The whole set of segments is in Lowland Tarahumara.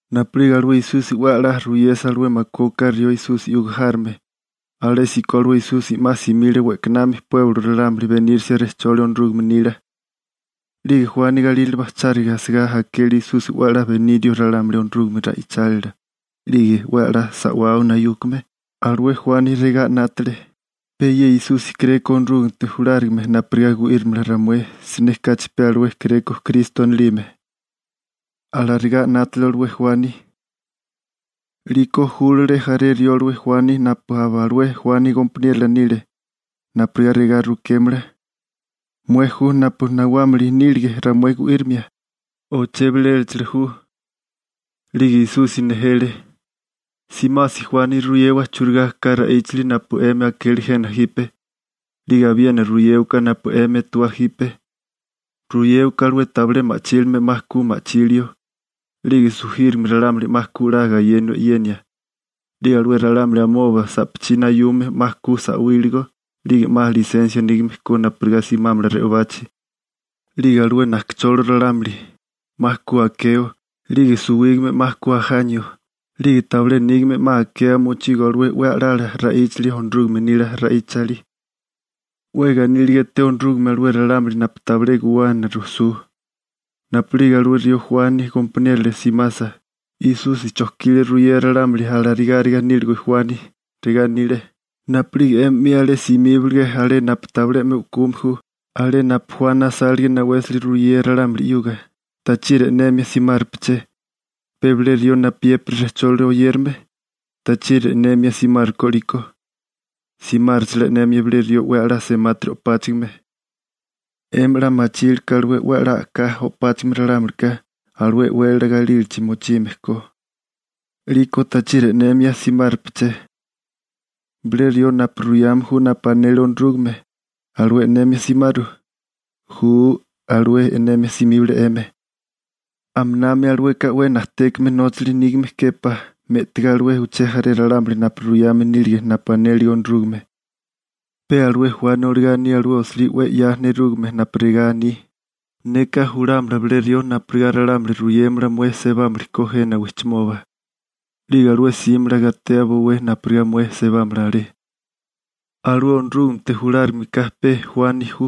Napu'lige alué Esusi 'we a'lá ruyesa alué makué oká rió Esusi 'yuga járome, alésíko alué Esusi 'ma simile we'kanami pueblo ralámuli benírisia rejcholi Onorúgame nila. 'Lige Juani galírale bajcháriga asigá akele Esusi 'we a'lá benirio ralámuli Onorúgame ra'ichálila 'lige 'we a'lá sa'wao nayúkame, alué Juani regá 'nátele: «Pe ye Esusi kéréko Onorúgamete julárigame napurigá gu'írimala ramué, siné kachi pe alué kéréko Kristo anilime.» Alarigá 'nátele alué Juani. 'Liko júlale jaré rió alué Juani napu aba alué Juani gompaniérola nile napurigá regá rukémala: ―¿Mué ju napu nawámili nílige ramué gu'írimia, o chebiléchala ju? 'Lige Esusi nejele: ―Simasi Juani ruyewa churigá ka ra'íchali napu 'emi akele jena jipe, 'lige abiena ruyéwaká napu 'emi etewá jipe. Ruyéwaká alué tabilé ma'chílime 'ma ku ma'chilio, 'lige sujírigame ralámuli 'ma ku 'la gayenio e'yenia, 'lige alué ralámuli amoba sa'pachí nayume 'ma ku sa'wíligo 'lige 'ma lisensia nígame ko napurigá simámala re'obachi, 'lige alué najkacholo ralámuli 'ma ku akeo, 'lige suwígame 'ma ku ajanio, 'lige tabilé nígame 'ma akea mochigo alué 'we a'lala ra'íchali Onorúgame nila ra'íchali. 'We ganíliga eté Onorúgame alué ralámuli napu tabilé guwana rujsú. Napu'lige alué rió Juani gompaniérola simasa, Esusi chojkile ruyea ralámuli alarigáriga níligo Juani. Regá anile: ―Napu'lige 'emi 'mi alé simíbalige alé napu tabilé 'me u'kume ju, alé napu Juani asálige nawésali ruyea ralámuli 'yuga, ¿tachiri e'nemia simárupeché? ¿Pe bilé rió napuyépiri rejcholi oyérame? ¿Tachiri e'nemia simárukó 'liko? ¿Simáruchalá e'nemia bilé rió 'we a'lá semátiri o'páchigime? 'Emi 'la machilke alué 'we a'lá a'ká o'páchigime ralámulika alué e'wélala galílachi mochime ko. ¿'Liko tachiri e'nemia simárupeché? ¿Bilé rió napu ruyame ju napu anele Onorúgame, alué e'nemia simaru? Ju, alué e'nemia simíbale 'emi. Aminami alueka 'we najtékame nóchali nígame júpá, me'tigá alué uché jaré ralámuli napu ruyame nílige napu anélige Onorúgame. Pe alué Juani olagá aní alué osilí 'we 'ya nerúgame napu regá aní: Neka julámala bilé rió napurigá ralámuli ruyémala mué sebámili ko jena wijchimoba. 'Lige alué 'símala gatea bowé napurigá mué sebámala alé. Alué Onorúgamete julárigame ka pe Juani ju.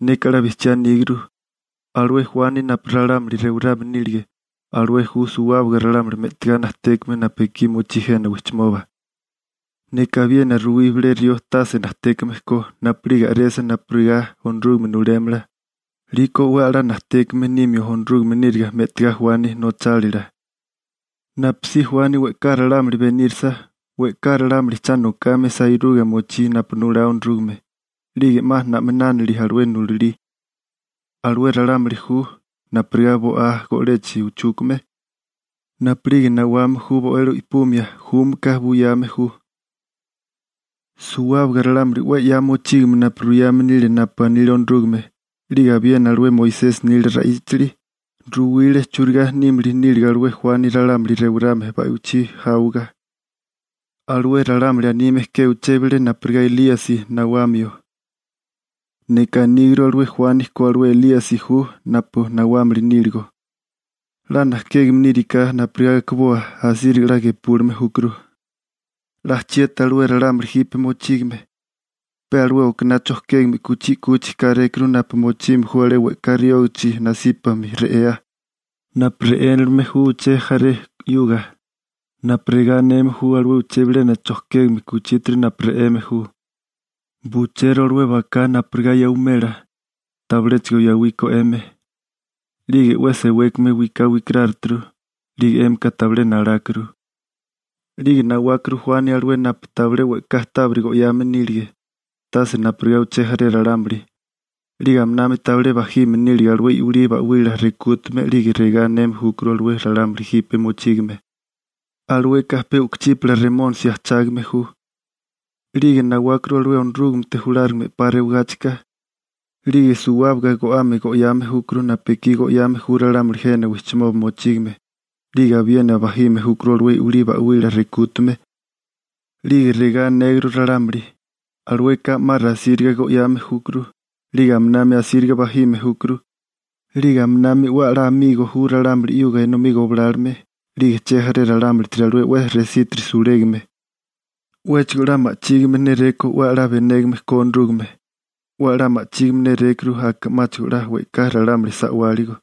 Neka 'la bijchía aníguru: Alué Juani napu ralámuli rewarame nílige, alué ju suwábaga ralámuli me'tigá najtékame napu ekí mochí jena wijchimoba. Neka abiena ruwí bilé rió tase najtékame ko, napu'lige a'resa napurigá Onorúgame nulémala, 'liko 'we a'lá najtékame nimio Onorúgame níriga me'tigá Juani nochálila. › Napusí Juani we'ká ralámuli benírasa, we'ká ralámuli cha nokame sairuga mochí napu nulá Onorúgame. 'Lige 'ma na'minánili alué nulalí (Alué ralámuli ju napurigá bo'á go'lechi uchúkame. Napu'lige nawame ju bo'elo i'pumia, júmaka buyame ju.) Suwábaga ralámuli 'we 'ya mochígame napu ruyame nile napu anile Onorúgame, 'lige abiena alué Moisesi nila ra'íchali, ruwile churigá nímili níliga alué Juani ralámuli rewarame ba'wichí jáwaga. Alué ralámuli anime ke uché bilé napurigá Elíasi nawamio. Neka aníguru alué Juani ko alué Elíasi ju napu nawámili níligo. 'La najkégame níriká napurigá akiboa, asíriga 'la gepúlime júkuru. › ¿'La chieti alué ralámuli jipe mochígame? Pe alué okaná chojkégame kuchí 'kuchi kárékuru napu mochime ju alé we'ká riógachi nasípami re'ea, napu re'énilime ju uché jaré 'yuga, napu regá aneme ju alué uché bilena chojkégame kuchítiri napu re'eme ju: «Bucheru alué baká napurigá 'emi yawimela, tabiléchigo yawíkó 'emi. 'Lige 'we sewékame wiká wikaráruturu, 'lige 'emi tabilé nalákuru.» 'Lige nawákuru Juani alué napu tabilé we'ká tábiri go'yame nílige, tase napurigá uché jaré ralámuli, 'lige aminami tabilé bajime nílige alué i'wilí ba'wila rekútame 'lige regá aneme júkuru alué ralámuli jipe mochígame: «Alueka pe u'kuchípala remónisi ajchágame ju.» 'Lige nawákuru alué Onorúgamete julárigame 'pa rewagáchika, 'lige suwábaga go'ame go'yame júkuru napu ekí go'yame ju ralámuli jena wijchimoba mochígame, 'lige abiena bajime júkuru alué i'wilí ba'wila rekútame. 'Lige regá anéguru ralámuli: «Alueka 'ma rasíriga go'yame júkuru, 'lige aminami asíriga bajime júkuru, 'lige aminami 'we a'lá amigo ju ralámuli 'yuga enomí goblálome 'lige chejaré ralámulitiri alué 'we resítiri sulégame.» 'Wéchigo 'la ma'chígime néréko 'we a'lá benégame ko Onorúgame, 'we a'lá ma'chígime nérékuru 'ma 'la we'ká ralámuli sa'wáligo.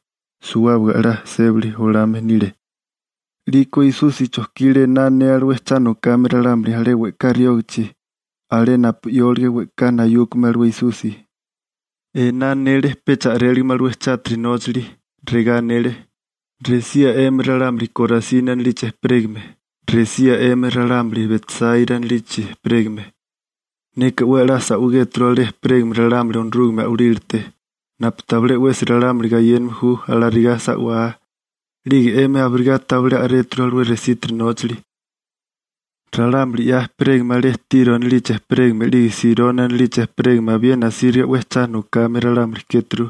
Suwábaga a'lá sébali olame nile. 'Liko Esusi chojkile ená anea alué cha nokame ralámuli alé we'ká riógachi alé napu 'yólige we'ká nayúkame alué Esusi. Ená anele pecha a'réligame alué chátiri nóchali. Regá anele: ―¡Resía 'emi ralámuli Korasini anilichi ejperégame! ¡Resía 'emi ralámuli Betsáira anilichi ejperégame! Neka 'we a'lá sa'wigéturu alé ejperégame ralámuli Onorúgame a'walílate napu tabilé 'wesi ralámuli gayéname ju alarigá sa'wá, 'lige 'emi abirigá tabilé a'réturu alué resítiri nóchali. Ralámuli 'ya ejperégame alé Tiro anilichi ejperégame 'lige Sironi anilichi ejperégame abiena asíriga 'we cha nokame ralámuli kéturu.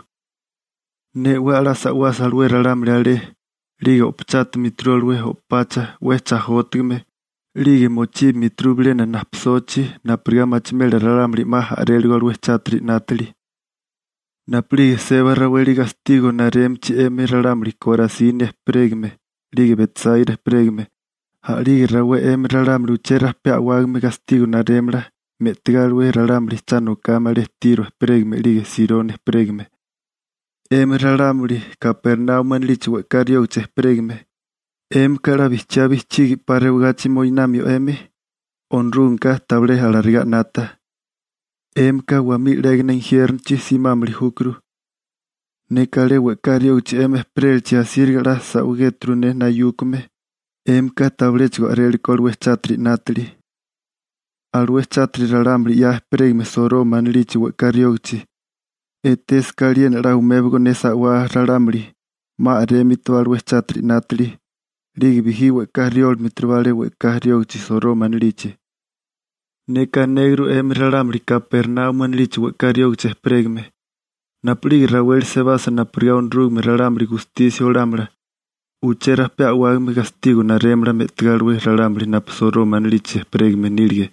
Ne 'we a'lá sa'wasa alué ralámuli alé, 'lige o'pachátimituru alué o'pacha 'we chajótigame, 'lige mochíbimituru bilena najpisochi napurigá machimela ralámuli 'ma a'réligo alué chátiri 'nátili. Napu'lige seba raweli gastigo narémichi 'emi ralámuli Korasini ejperégame 'lige Betsáira ejperégame, a'lige rawé 'emi ralámuli uché rajpé a'wágame gastigo narémala me'tigá alué ralámuli cha nokame alé Tiro ejperégame 'lige Sironi ejperégame. 'Emi ralámuli Kapernaumi anilichi we'ká riógichi ejperégame, ¿'émika 'la bijchiá bijchigi 'pa rewagachi moinamio 'emi? Onorúgameka tabilé alarigá 'nata. 'Émika wamí 'légana injiérnochi simámili júkuru. Neka alé we'ká riógichi 'emi ejperélachi asíriga 'la sa'wigéturu ne nayúkame, 'émika tabiléchigo a'rélekó alué chátiri 'nátili. Alué chátiri ralámuli 'ya ejperégame Soroma anilichi we'ká riógichi, etésaká aliena 'la umébigo ne sa'wá ralámuli, 'ma a'rémitibá alué chátiri 'nátili, 'lige bijí 'la we'ká riólimiturubá alé we'ká riógichi Soroma anilichi. Neka anéguru 'emi ralámuli Kapernaumi anilichi we'ká riógichi ejperégame, napu'lige raweli sebasa napurigá Onorúgame wanápamia chátiri 'nátame ralámuli (gustisia olámala), uché rajpé a'wágame gastigo narémala me'tigá alué ralámuli napu Soroma anilichi ejperégame nílige.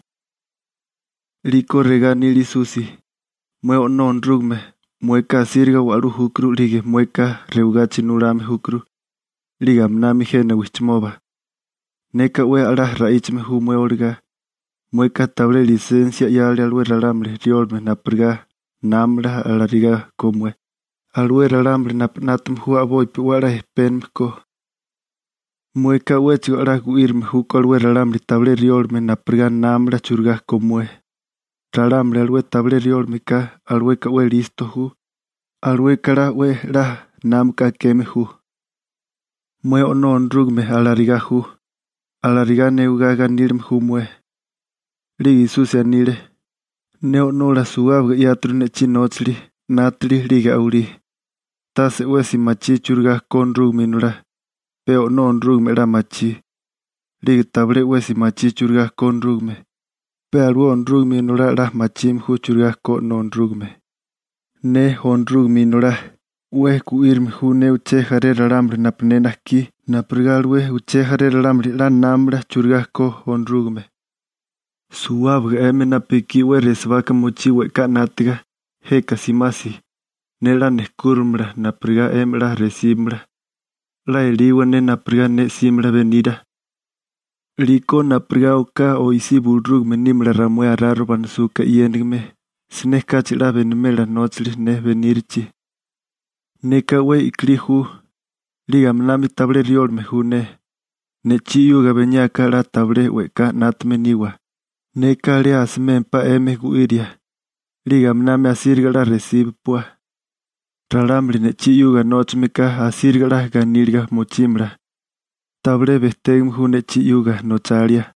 'Liko regá anile Esusi: ―Mué O'nó Onorúgame, mueka asíriga wa'lú júkuru 'lige mueka rewagachi nulame júkuru, 'lige aminami jena wijchimoba. Neka 'we a'lá ra'íchame ju mué olagá, mueka tabilé lisensia 'yale alué ralámuli riólame napurigá námamala alarigá ko mué, alué ralámuli napu 'nátame ju a'bopi 'we a'lá ejpénigime ko. Mueka 'wéchigo a'lá gu'írame júkó alué ralámuli tabilé riólame napurigá námamala churigá ko mué. Ralámuli alué tabilé riólame ka, alueka 'we listo ju, alueka 'la 'we a'lá námaka akeme ju. Mué O'nó Onorúgame, alarigá ju. Alarigá newigá ganílame ju mué. 'Lige Esusi anile: ―Ne O'nola suwábaga 'yáturu ne'chí nóchali, 'nátili 'lige a'walí. Tase 'wesi machí churigá ko Onorúgame Inolá, pe O'nó Onorúgame 'la machí. 'Lige tabilé 'wesi machí churigá ko Onorúgame, pe alué Onorúgame Inolá 'la machime ju churigá ko O'nó Onorúgame. Ne, Onorúgame Inolá, 'we gu'írame ju ne uché jaré ralámuli napu ne najkí napurigá alué uché jaré ralámuli 'la námamala churigá ko Onorúgame. Suwábaga 'emi napu ekí 'we resibaka mochí we'ká 'nátaga, jeka simasi, ne 'la nejkúramala napurigá 'emi 'la resíbamala. 'La eliwa ne napurigá ne 'símala benira, 'liko napurigá oká oisí bulurúgame nímala ramué araro banasuka e'yénigime, siné kachi 'la benimela nóchali ne benírichi. Neka 'we i'kilí ju. 'Lige aminami tabilé riólame ju ne. Ne'chí 'yuga beniáká 'la tabilé we'ká 'nátame niwa, neka alé asimémpá 'emi gu'íria. 'Lige aminami asíriga 'la resíbapua. Ralámuli ne'chí 'yuga nóchameka asíriga 'la ganíliga mochímala. Tabilé bejtégame ju ne'chí 'yuga nochalia.